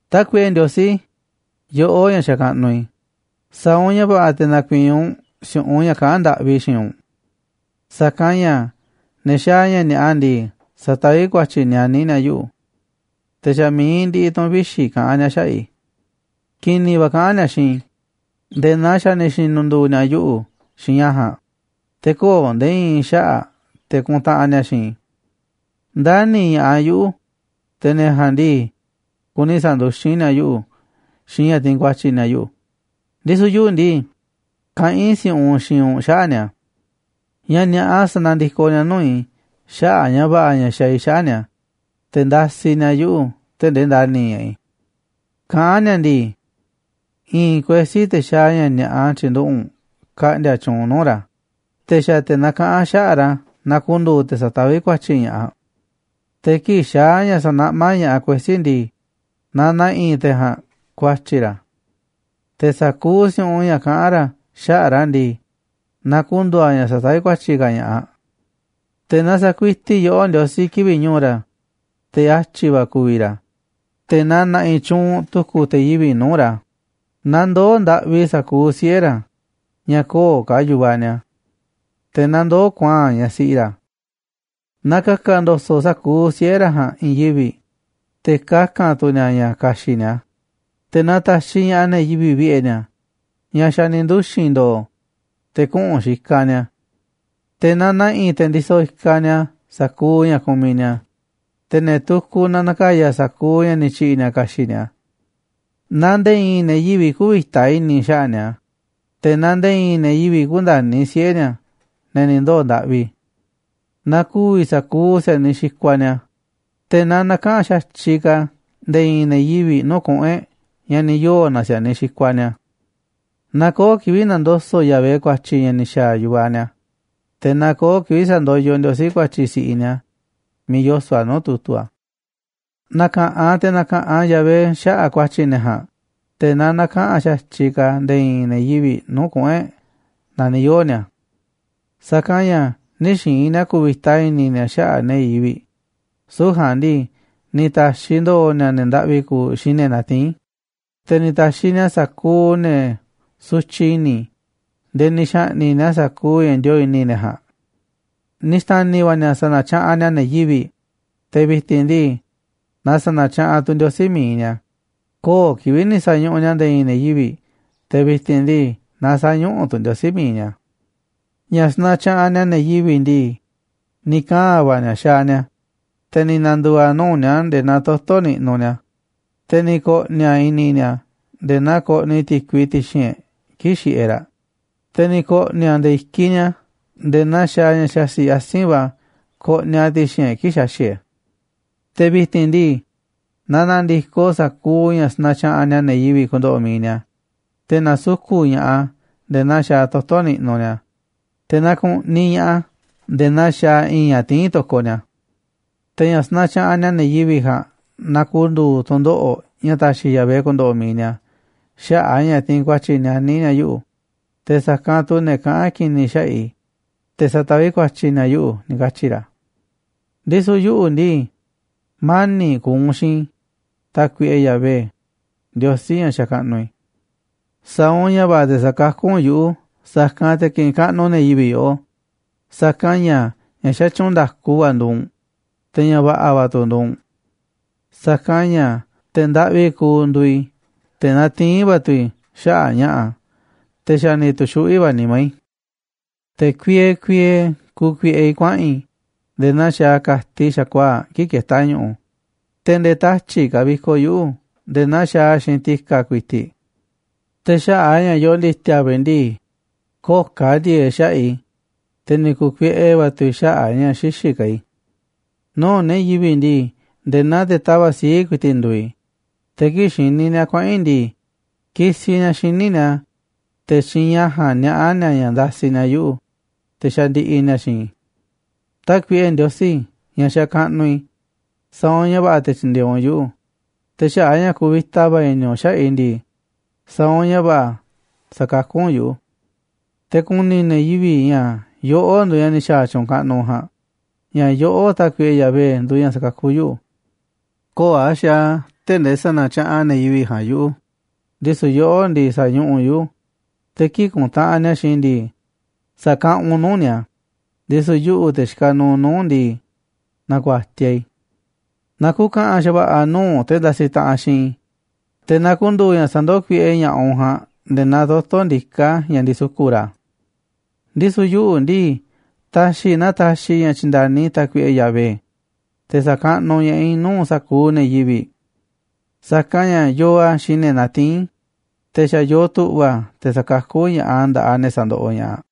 Tákuiꞌe Ndiosí, yoꞌó ña̱ xakaꞌnuꞌ i̱, sa̱a̱ u̱nꞌ ña̱ va̱ꞌa̱ te̱ na̱ku̱i̱i̱n u̱nꞌ si̱u̱ꞌunꞌ ña̱ kaꞌán ndaꞌvi i̱ xiinꞌ u̱nꞌ. Sa̱kanꞌ ña̱ ne̱ xaaꞌ ña̱ ni̱a̱ꞌa ndii, sataví ku̱a̱tyi̱ nianí ni̱a̱ yuꞌu̱, te̱ xa̱ mi̱iꞌ ndiꞌiꞌ tu̱ꞌu̱n vixi̱ kaꞌán ni̱a̱ xaꞌa̱ꞌ i̱. Ki̱ni̱ va̱ kaꞌán ni̱a̱ xiinꞌ i̱ nde̱e̱ naa xa̱ ni̱ xi̱nu̱ndu̱u̱ ni̱a̱ yuꞌu̱ xiinꞌ ña̱ ja̱a̱nꞌ, te̱ köo̱ꞌ nde̱e̱ i̱i̱n xaꞌa̱ꞌ te̱ kuntaꞌanꞌ ni̱a̱ xiinꞌ i̱. Ndani̱ ña̱ꞌaꞌ yuꞌu̱, te̱ ne̱ ja̱a̱nꞌ ndii, kuni sa̱nduxín ni̱a̱ yuꞌu̱ xiinꞌ ña̱ tiinꞌ ku̱a̱tyi̱ ni̱a̱ yuꞌu̱, ndisu̱ yuꞌu̱ ndii, kaꞌán i̱ si̱u̱ꞌunꞌ xiinꞌ u̱nꞌ xaꞌa̱ꞌ ni̱a̱. Ña̱ ni̱a̱ꞌa sa̱na̱ndikoꞌ ni̱a̱ nuu̱ꞌ i̱ xaꞌa̱ꞌ ña̱ va̱ꞌa̱ ña̱ xaaꞌ i̱ xaꞌa̱ꞌ ni̱a̱, te̱ ndasiꞌ ni̱a̱ yuꞌu̱ tee̱ꞌ ndee ndani̱ ña̱ꞌaꞌ i̱. Kaꞌán ni̱a̱ ndii: “I̱i̱n kuesí, te̱ xaaꞌ ña̱ ni̱a̱ꞌa, tyi̱nduꞌu̱ꞌ u̱nꞌ ka̱ꞌndi̱a̱ tyuunꞌ nuu̱ꞌ ra̱, te̱ xa̱ te̱ nakaꞌán xaꞌa̱ꞌ ra̱ na ku̱ndu̱u̱ te̱ sa̱taví ku̱a̱tyi̱ ña̱ꞌaꞌ. Te̱ kii̱ꞌ xaa̱ ña̱ sa̱naꞌmá ña̱ꞌaꞌ kuesí ndii, na na̱ꞌi̱ te̱ ja̱a̱nꞌ ku̱a̱tyi̱ ra̱, te̱ sa̱kuuꞌ si̱u̱ꞌunꞌ ña̱ kaꞌa̱n ra̱ xaꞌa̱ꞌ ra̱ ndii, na ku̱ndu̱u̱ a̱ ña̱ sa̱taví ku̱a̱tyi̱ ka̱ ña̱ꞌaꞌ. Te̱ na sa̱kuiti yoꞌó, Ndiosí, kivi̱ꞌ ñu̱u̱ ra̱, te̱ atyi̱ ku̱vi̱ ra̱, te̱ na na̱ꞌi̱ tyuunꞌ tu̱ku̱ te̱ yivi̱ꞌ nuu̱ꞌ ra̱. Na ndoo̱ ndaꞌvi sa̱kuuꞌ siꞌe̱ ra̱ ña̱ köo̱ꞌ ka̱ yu̱vaꞌ ni̱a̱, te̱ na ndoo̱ kuaa̱nꞌ ñaꞌ siꞌi ra̱. Na ka̱ka̱ ndo̱so̱ꞌ sa̱kuuꞌ siꞌe̱ ra̱ ja̱a̱nꞌ i̱i̱n yivi̱ꞌ, te̱ kaka̱n tu̱ ni̱a̱ ña̱ ka̱xi̱ꞌ ni̱a̱, te̱ na ta̱xiꞌ ña̱ꞌaꞌ ne̱ yivi̱ꞌ vi̱ꞌe̱ ni̱a̱, ña̱ xa̱ ni̱ nduxi̱n ndo̱o̱, te̱ kuꞌu̱n xikaꞌ ni̱a̱. Te̱ na na̱ꞌi̱ te̱ ndisoꞌ ikaꞌ ni̱a̱ sa̱kuuꞌ ña̱ kumiꞌ ni̱a̱, te̱ ne̱ tukuꞌ na na̱ka̱ya̱ sa̱kuuꞌ ña̱ ni̱ tyi̱ꞌi̱ ni̱a̱ ka̱xi̱ꞌ ni̱a̱. Na nde̱e̱ i̱i̱n ne̱ yivi̱ꞌ kü̱vi̱ta i̱ni̱ xaꞌa̱ꞌ ni̱a̱, te̱ na nde̱e̱ i̱i̱n ne̱ yivi̱ꞌ kü̱ndani̱ siꞌe̱ ni̱a̱, ne̱ ni̱ ndoo̱ ndaꞌvi. Na ku̱vi̱ sa̱kuuꞌ si̱a̱niꞌ xikuaꞌ ni̱a̱, te̱ na näkaꞌanꞌ xa̱tyiꞌ ka̱ nde̱e̱ i̱i̱n ne̱ yivi̱ꞌ nuu̱ꞌ kuꞌu̱n e̱ꞌ ña̱ ni̱ yoo̱ na si̱a̱niꞌ xikuaꞌ ni̱a̱. Na köo̱ꞌ kivi̱ꞌ na̱ndoso̱ꞌ Yahvé ku̱a̱tyi̱ ña̱ ni̱ xa̱a̱ yu̱vaꞌ ni̱a̱, te̱ na köo̱ꞌ kivi̱ꞌ sa̱ndoyoꞌ Ndiosí ku̱a̱tyi̱ si̱ꞌiꞌ ni̱a̱ miiꞌ yoso̱ꞌ a̱ nuu̱ꞌ tu̱tu̱ a̱. Na̱ka̱ꞌanꞌ te̱ na̱ka̱ꞌanꞌ Yahvé xaꞌa̱ꞌ ku̱a̱tyi̱ ne̱ ja̱a̱nꞌ, te̱ na näkaꞌanꞌ xa̱tyiꞌ ka̱ nde̱e̱ i̱i̱n ne̱ yivi̱ꞌ nuu̱ꞌ kuꞌu̱n e̱ꞌ naaꞌ ni̱ yoo̱ ni̱a̱. Sa̱kanꞌ ña̱ nï̱ xi̱i̱n ni̱a̱ ku̱vi̱ta i̱ni̱ ni̱a̱ xaꞌa̱ꞌ ne̱ yivi̱ꞌ, süu̱ꞌ ja̱a̱nꞌ ndii, ni̱ ta̱xiꞌ ndo̱o̱ ni̱a̱ ne̱ ndaꞌvi kuuꞌ xiinꞌ ne̱ natiín, te̱ ni̱ ta̱xiꞌ ni̱a̱ sa̱kuuꞌ ne̱ sutyiꞌ i̱ni̱ nde̱e̱ ni̱ xa̱ꞌni̱ꞌ ni̱a̱ sa̱kuuꞌ ña̱ ndioo̱ꞌ i̱ni̱ ne̱ ja̱a̱nꞌ. Ni̱ xta̱ni̱ va̱ ni̱a̱ sa̱na̱tyaꞌanꞌ ni̱a̱ ne̱ yivi̱ꞌ, te̱ vi̱ti̱n ndii, na sa̱na̱tyaꞌanꞌ tu̱ Ndiosí mi̱iꞌ ni̱a̱, köo̱ꞌ kivi̱ꞌ ni̱ sa̱ñuꞌuꞌ ni̱a̱ nde̱e̱ i̱i̱n ne̱ yivi̱ꞌ, te̱ vi̱ti̱n ndii, na sä̱ñuꞌuꞌ tu̱ Ndiosí mi̱iꞌ ni̱a̱. Ña̱ sanatyaꞌanꞌ ni̱a̱ ne̱ yivi̱ꞌ ndii, ni̱ kaa̱n va̱ ni̱a̱ xaaꞌ ni̱a̱ a̱, te̱ ni̱ na̱ndu̱u̱ a̱ nuu̱ꞌ ni̱a̱ nde̱e̱ naa toto̱ niꞌnuꞌ ni̱a̱, te̱ ni̱ ko̱ꞌni̱ a̱ i̱ni̱ ni̱a̱ nde̱e̱ naa koꞌniꞌ ti̱kui ti̱xi̱n e̱ꞌ kii̱ꞌ xiꞌiꞌ e̱ꞌ raꞌ, te̱ ni̱ ko̱ꞌni̱ a̱ nde̱e̱ i̱kiꞌ ni̱a̱ nde̱e̱ naa xaaꞌ ña̱ xaxi̱ꞌ asi̱nꞌ va̱ koꞌniꞌ a̱ ti̱xi̱n e̱ꞌ kii̱ꞌ xaxi̱ꞌ e̱ꞌ. Te̱ vi̱ti̱n ndii, na na̱ndi̱koꞌ sa̱kuuꞌ ña̱ sanatyaꞌanꞌ ni̱a̱ ne̱ yivi̱ꞌ ku̱ndo̱ꞌo̱ mi̱iꞌ ni̱a̱, te̱ na̱suku̱ꞌ ña̱ꞌaꞌ a̱ nde̱e̱ naa xaaꞌ toto̱ niꞌnuꞌ ni̱a̱, te̱ naa ku̱ꞌniꞌ ña̱ꞌaꞌ a̱ nde̱e̱ naa xaaꞌ i̱i̱nꞌ ña̱ tiín to̱koꞌ ni̱a̱. Te̱ ña̱ sanatyaꞌanꞌ ni̱a̱ ne̱ yivi̱ꞌ ja̱a̱nꞌ na ku̱ndu̱u̱ tu̱ndoꞌo̱ꞌ ña̱ taxiꞌ Yahvé ku̱ndo̱ꞌo̱ mi̱iꞌ ni̱a̱ xaꞌa̱ꞌ a̱ ña̱ tiinꞌ ku̱a̱tyi̱ nianí ni̱a̱ yuꞌu̱, te̱ sa̱kanꞌ tu̱ ne̱ kaꞌán ki̱ni̱ xaꞌa̱ꞌ i̱, te̱ sataví ku̱a̱tyi̱ ni̱a̱ yuꞌu̱”, ni̱ katyi̱ ra̱. Ndisu̱ yuꞌu̱ ndii, mani̱ꞌ ku̱u̱ u̱nꞌ xiinꞌ i̱, Tákuiꞌe Yahvé, Ndiosí ña̱ xakaꞌnuꞌ i̱. Sa̱a̱ u̱nꞌ ña̱ va̱ꞌa̱ te̱ sa̱kakú u̱nꞌ yuꞌu̱, sa̱kanꞌ te̱ kiꞌinꞌ kaꞌnuꞌ ne̱ yivi̱ꞌ yoꞌó, sa̱kanꞌ ña̱ ña̱ xatyuunꞌ nda̱ku va̱ nduuꞌ u̱nꞌ, te̱ ña̱ va̱ꞌa̱ va̱ tu̱ nduuꞌ u̱nꞌ. Sa̱kanꞌ ña̱ te̱ ndaꞌvi kuuꞌ nduuꞌ i̱, te̱ natiín va̱ tu̱ i̱ xaꞌa̱ꞌ ña̱ꞌa̱, te̱ xa̱ ni̱ tu̱xuꞌví va̱ nimá i̱. Te̱ kuiee kuiee kukuiꞌe i̱ kuaꞌa̱n i̱, nde̱e̱ naa xaaꞌ ka̱tiꞌ xa̱kuaa̱ꞌ kii̱ꞌ ketá ñu̱ꞌu̱, te̱ nde̱e̱ tatyi̱ꞌ kavikoꞌ yuꞌu̱ nde̱e̱ naa xaaꞌ a̱ xiinꞌ ti̱ka̱ ku̱i̱ti̱ꞌ. Te̱ xaꞌa̱ꞌ a̱ ña̱ yoo ndi̱ti̱a̱ va̱ i̱ ndii, köo̱ꞌ ka̱ ndi̱e̱e̱ꞌ xaꞌa̱ꞌ i̱, te̱ ni̱ ku̱kuiꞌe va̱ tu̱ i̱ xaꞌa̱ꞌ a̱ ña̱ xïxiꞌ ka̱ i̱. Nuu̱ꞌ ne̱ yivi̱ꞌ ndii, nde̱e̱ naa te̱ tava̱ꞌ sii̱ꞌ ku̱i̱ti̱ꞌ nduuꞌ i̱, te̱ kii̱ꞌ xini ni̱a̱ kuaꞌa̱n i̱ ndii, kisiꞌ ni̱a̱ xíniꞌ ni̱a̱, te̱ xiinꞌ ña̱ ja̱a̱nꞌ niaꞌá ni̱a̱ ña̱ ndasiꞌ ni̱a̱ yuꞌu̱, te̱ xandiꞌiꞌ ni̱a̱ xiinꞌ i̱. Tákuiꞌe Ndiosí ña̱ xakaꞌnuꞌ i̱, sa̱a̱ u̱nꞌ ña̱ va̱ꞌa̱ te̱ tyi̱ndi̱e̱eꞌ u̱nꞌ yuꞌu̱, te̱ xaꞌa̱ꞌ a̱ ña̱ kuvita va̱ i̱ni̱ u̱nꞌ xaꞌa̱ꞌ i̱ ndii, sa̱a̱ u̱nꞌ ña̱ va̱ꞌa̱ sa̱kakú u̱nꞌ yuꞌu̱. Te̱ ku̱ni̱ ne̱ yivi̱ꞌ ña̱ yoꞌó nduuꞌ ña̱ ni̱ xa̱a̱ tyu̱u̱n kaꞌnuꞌ ja̱a̱nꞌ, ña̱ yoꞌó, Tákuiꞌe Yahvé, nduuꞌ ña̱ sakakú yuꞌu̱. Köo̱ꞌ a̱ xaaꞌ a̱ tee̱ꞌ ndee sa̱na̱tyaꞌanꞌ ne̱ yivi̱ꞌ ja̱a̱nꞌ yuꞌu̱, ndisu̱ yoꞌó ndii, sa̱ñuꞌuꞌ u̱nꞌ yuꞌu̱, te̱ kii̱ꞌ kuntaꞌanꞌ ni̱a̱ xiinꞌ i̱ ndii, sa̱kaꞌanꞌ u̱nꞌ nuu̱ꞌ ni̱a̱, ndisu̱ yuꞌu̱, te̱ xikaꞌ nuuꞌ nuu̱ꞌ u̱nꞌ ndii, na̱ku̱a̱tiaꞌ i̱. Na ku̱ka̱ꞌa̱n xa̱va̱ꞌa̱ nuu̱ꞌ te̱ ndasiꞌ taꞌanꞌ xiinꞌ i̱, te̱ na ku̱ndu̱u̱ ña̱ sa̱ndoó kuiꞌe ña̱ꞌaꞌ u̱nꞌ ja̱a̱nꞌ nde̱e̱ naa toto̱ ndiká ña̱ ndisuku̱ꞌ ra̱. Ndisu̱ yuꞌu̱ ndii, ta̱xi̱ i̱ na taxiꞌ i̱ ña̱ tyi̱nda̱ni Tákuiꞌe Yahvé, te̱ sa̱kaꞌnuꞌ ña̱ꞌaꞌ i̱ nuu̱ꞌ sa̱kuuꞌ ne̱ yivi̱ꞌ. Sa̱kanꞌ ña̱ yoo a̱ xiinꞌ ne̱ natiín, te̱ xa̱ yoo tu̱ꞌva̱ a̱ te̱ sa̱kakú ña̱ꞌaꞌ a̱ nda̱ꞌaꞌ ne̱ sandoꞌoꞌ ña̱ꞌaꞌ.